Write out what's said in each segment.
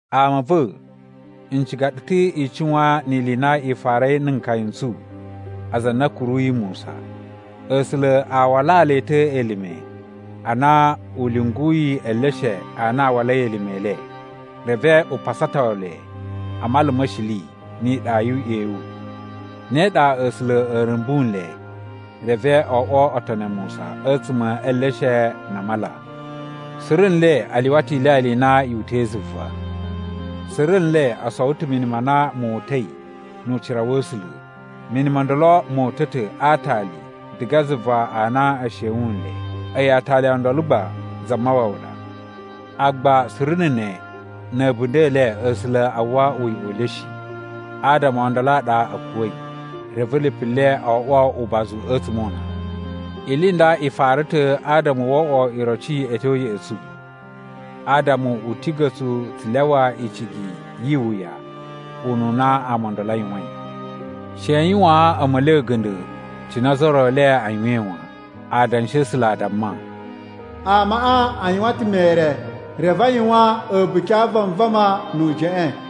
Ama a̱ va̱, n ciga ɗu ta̱ i cuwan ni ili i na i farai na̱ nkaya n tsu aza a na a̱ kuruyi Musa. A̱sula̱ a walaa le ta̱ elime ana u lyunguyi eleshe a na a walai elime e le, reve u pasato le a Mala ma̱ Shili ni iɗa yu uꞌyewu. Ne ɗa A̱sula̱ a̱ rumbu nle reve o oꞌwo otoni a Musa a̱tsuma̱ e eleshe na a mala. Suru nle a lyuwa ta̱ ilyalya i na yu uta̱i zuva. Suru nle o sowo ta̱ mini ma na mo uta̱i nu ucira wa̱ A̱sula̱. Mini mo ndolo mo uta̱ ta̱ a aatali diga zuva a na e shewun nle, a̱yi aatali o ndolo gba Zamawawa ɗa. Agba suru na̱ ne, na̱ a̱bunda̱ e le A̱sula̱ a uwwa uyoꞌo u le shi. Adama o ndolo a ɗa a̱ kuwa̱i, reve lipu le o oꞌwo ubazu a̱tsuma̱ o una. Ili i nda i fara ta̱ adama wo oꞌwo iroci a̱ tyo ya̱ꞌa̱ tsu, adama u tiga̱ tsu tsu lyawa icigi yi iwuya ununa ama o ndolo a yuwain. She i yuwaan a̱ma̱li a̱ga̱nda̱ cine ozo o ro e le a yuwain wan. Adanshi a̱ A̱sula̱ a damma, “Amaꞌa a yuwan ta̱ mere reve a yuwan a̱buki a vanvama nu ujeꞌen.”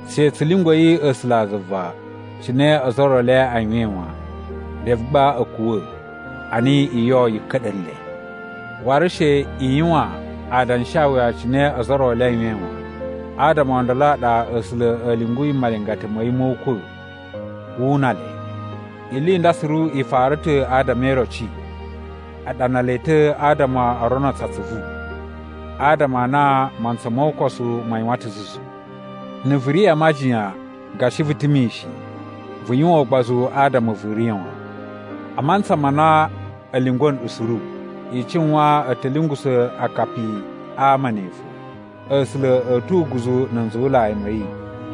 She tsu lyungwa̱i A̱sulazuva cine ozo o ro e le a yuwain wan, reve gba a̱ kuwa̱ ana iyo yi ka̱ɗa̱ nle. Waru she i yuwan adanshawuya cine ozo o ro e le a yuwain wan, adama o ndolo a ɗa A̱sula̱ a̱ lyunguyi malingata ma̱ yi mo ukwa̱ wu una le. Ili i nda suru i fara ta̱ adama e iroci. A ɗana le ta̱ adama o rono tsu atsuvu, adama a na mantsa mo ukosu ma yuwan ta̱ zuzu. Na̱ vu ri a majiyan gashi vu ta̱ mishin, vu yuwan ugbozu adama vu riya̱ wan. A mantsa ma na a̱ lyungwa̱ nɗu suru, i cuwan a̱ ta̱ lyungusa̱ akapi a ama ne fo. A̱sula̱ a̱ tu uguzu na̱ nzuwulai ma̱ yi,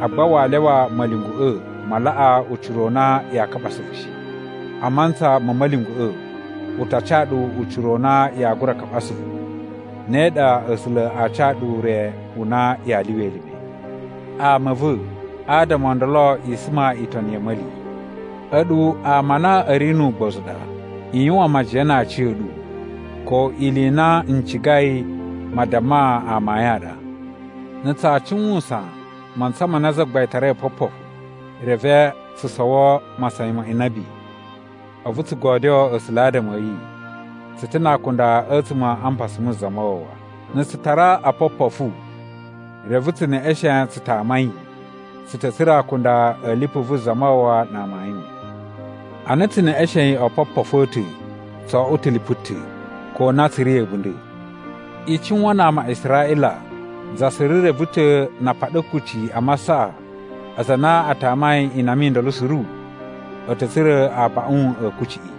agba waa lyawa ma̱lyungwa̱ꞌa̱ ma laꞌa ucira u na yaa kaɓa asuvu shi. A mantsa ma̱ ma̱lyungwa̱ꞌa̱, u ta ca ɗu ucira u na yaa gura kaɓa asuvu, ne ɗa A̱sula̱ aa ca ɗu ure u na yaa lyuwa elime. Ama a̱ va̱, adama o ndolo, i suma itoni ya̱ a̱ma̱li. A̱ɗu ama a na a̱ ri nu ugbozu u ɗa. I yuwan majiyan na aciya̱ɗu ko ili i na n cigai madamma amayun a ɗa. Na̱ tsaa cuwusan mantsa ma na Zagbain tarai opopofu, reve tsu sowo masayan ma inabi, a̱vu tsu godyoo A̱sula̱ adama a̱ yi, tsu ta̱ na akunda a̱tsuma̱ a mpasa mu Zamawawa. Na̱ tsu tara opopofu reve tsu neꞌeshen tsu tama yi, tsu ta̱ tsura̱ akunda a̱ lipu vu Zamawawa na amayun. Ana tsu neꞌeshein opopofu a̱ ta̱, tso oꞌwo ta̱ lipu ta̱, ko a na tsu ri a̱bunda̱. I cuwan na ama a Israꞌila, za suru reve ta̱ na a paɗa kucci a masaꞌa, aza a na a tamai inama i ndolo suru, a̱ ta̱ tsura̱ abaꞌun a̱ kucciꞌi.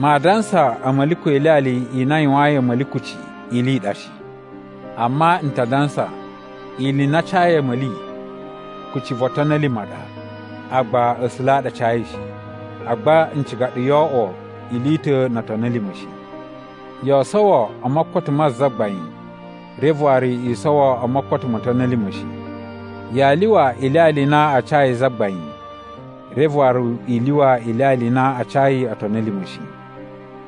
Maa dansa a̱ma̱li ko ilyalya i na a yuwayin a̱ma̱li kucci ili i ɗa shi. Amma n ta dansa ili i na a cayi a̱ma̱li, kucci vo otoni a̱ lima̱ a ɗa, agba A̱sula̱ a ɗa a cayi shi. Agba n ciga ɗu yoo oꞌwo ili i ta̱ no otoni a̱ lima̱ shi. Yoo sowo o mokoto ma Zagbain reve waru i sowo o mokoto mo otoni a̱ lima̱ shi. Yaa lyuwa ilyalya i na a cayi Zagbain reve waru i lyuwa ilyalya i na a cayi otoni a̱ lima̱ shi.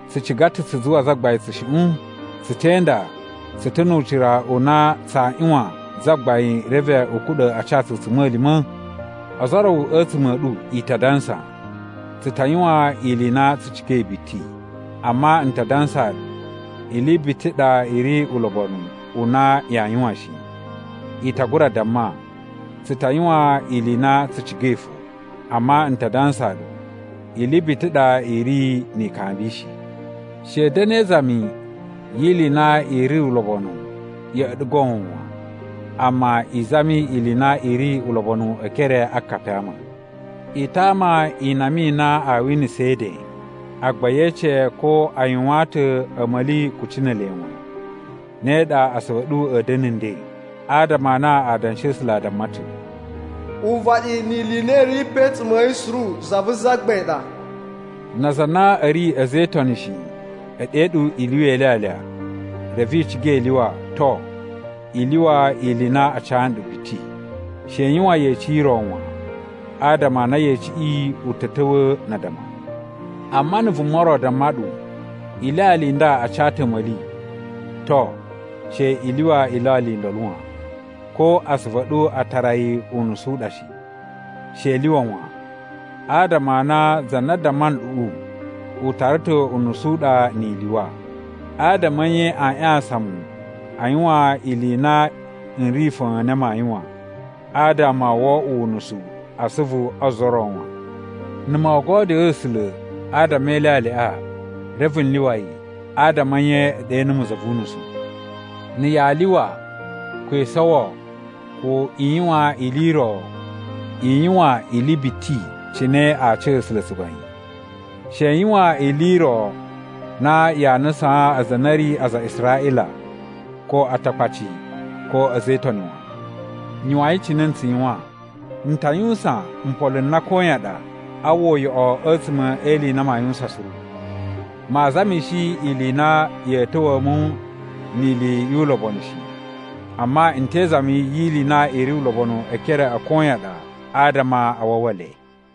Tsu ciga ta̱ tsu zuwa Zagbain tsushuꞌun? Tsu te inda tsu ta̱ nu ucira u na tsaa ꞌyuwan Zagbain reve u kuɗa̱ a ca tsu a̱tsuma̱lima̱? Ozo o ro a̱tsuma̱ a̱ ɗu i ta dansa, “Tsu ta yuwan ili i na tsu cigai biti!” Amma n ta dansaa ɗu ili biti i ɗa i ri ulobonu u na yaa yuwan shi. I ta gura damma, “Tsu ta yuwan ili i na tsu cigai fo!” Amma n ta dansaa ɗu ili biti i ɗa i ri ni ikambi shi. She i da̱na̱ e izami yi ili i na i ri ulobonu ya̱ꞌa̱ ɗu goon wan. Amma i zami ili i na i ri ulobonu e ekere a akapi a ama. I tama inama i na aa winasa e eden. Agba ye ece ko a yuwaan ta̱ a̱ma̱li kucci ne ele wan, ne ɗa asuvu a̱ ɗu a̱ da̱na̱ nden. Adama a na Adanshi a̱ A̱sula̱ a damma ta̱, “Uvaɗi ni ili i na i ri pe a̱tsuma̱ a̱ yi suru za vu Zagbain ɗa.” Na aza a na a̱ ri a̱za̱ e Itoni shi, e ɗe ɗu i lyuwa ilyalya, reve i ciga i lyuwa, to, i lyuwa ili i na a ca nɗu biti. She i yuwan yeci i ro wan, adama a na yeciꞌi u ta̱ ta̱wa̱a̱ na addama. Amma na̱ vuma ro damma ɗu, “Ilyalya i nda a ca ta̱ a̱ma̱li.” To, she i lyuwa ilyalya i ndolo wan, ko asuvu a̱ ɗu a tara yi unusu u ɗa shi. She i lyuwa wan, adama a na za na damma nɗuꞌu, u tara ta̱ unusu u ɗa ni i lyuwa. Adama a̱ nye aa ꞌyasan mu a yuwan ili i na n ri fa̱a̱n na maa yuwan, adama wo oꞌwo unusu a asuvu o ozo o ro wan? Na̱ moo godyoo A̱sula̱ adama e ilyalyaꞌa reve n lyuwa yi, adama a̱ nye e ɗe numu za vu unusu? Na̱ yaa lyuwa, ko i sowo, ko i yuwan ili i ro, i yuwan ili biti cine aa ca A̱sula̱ tsugbain. She i yuwan ili i ro na yaa nusaan aza a na a̱ ri aza a Israꞌila, ko Atakpaci, ko a̱za̱ e Itoni wan. Yuwain cine n tsu yuwan. N ta yuwusan mpolo n na koyan ɗa a uwwa uyoꞌo a̱tsuma̱ e ili i na maa yuwusan suru. Maa zamishi ili i na ya̱a̱ ta̱wa̱a̱ mu ni ili yu ulobonu shi, amma n te izami yi ili i na i ri ulobonu e ekere a koyan ɗa adama a wawa le.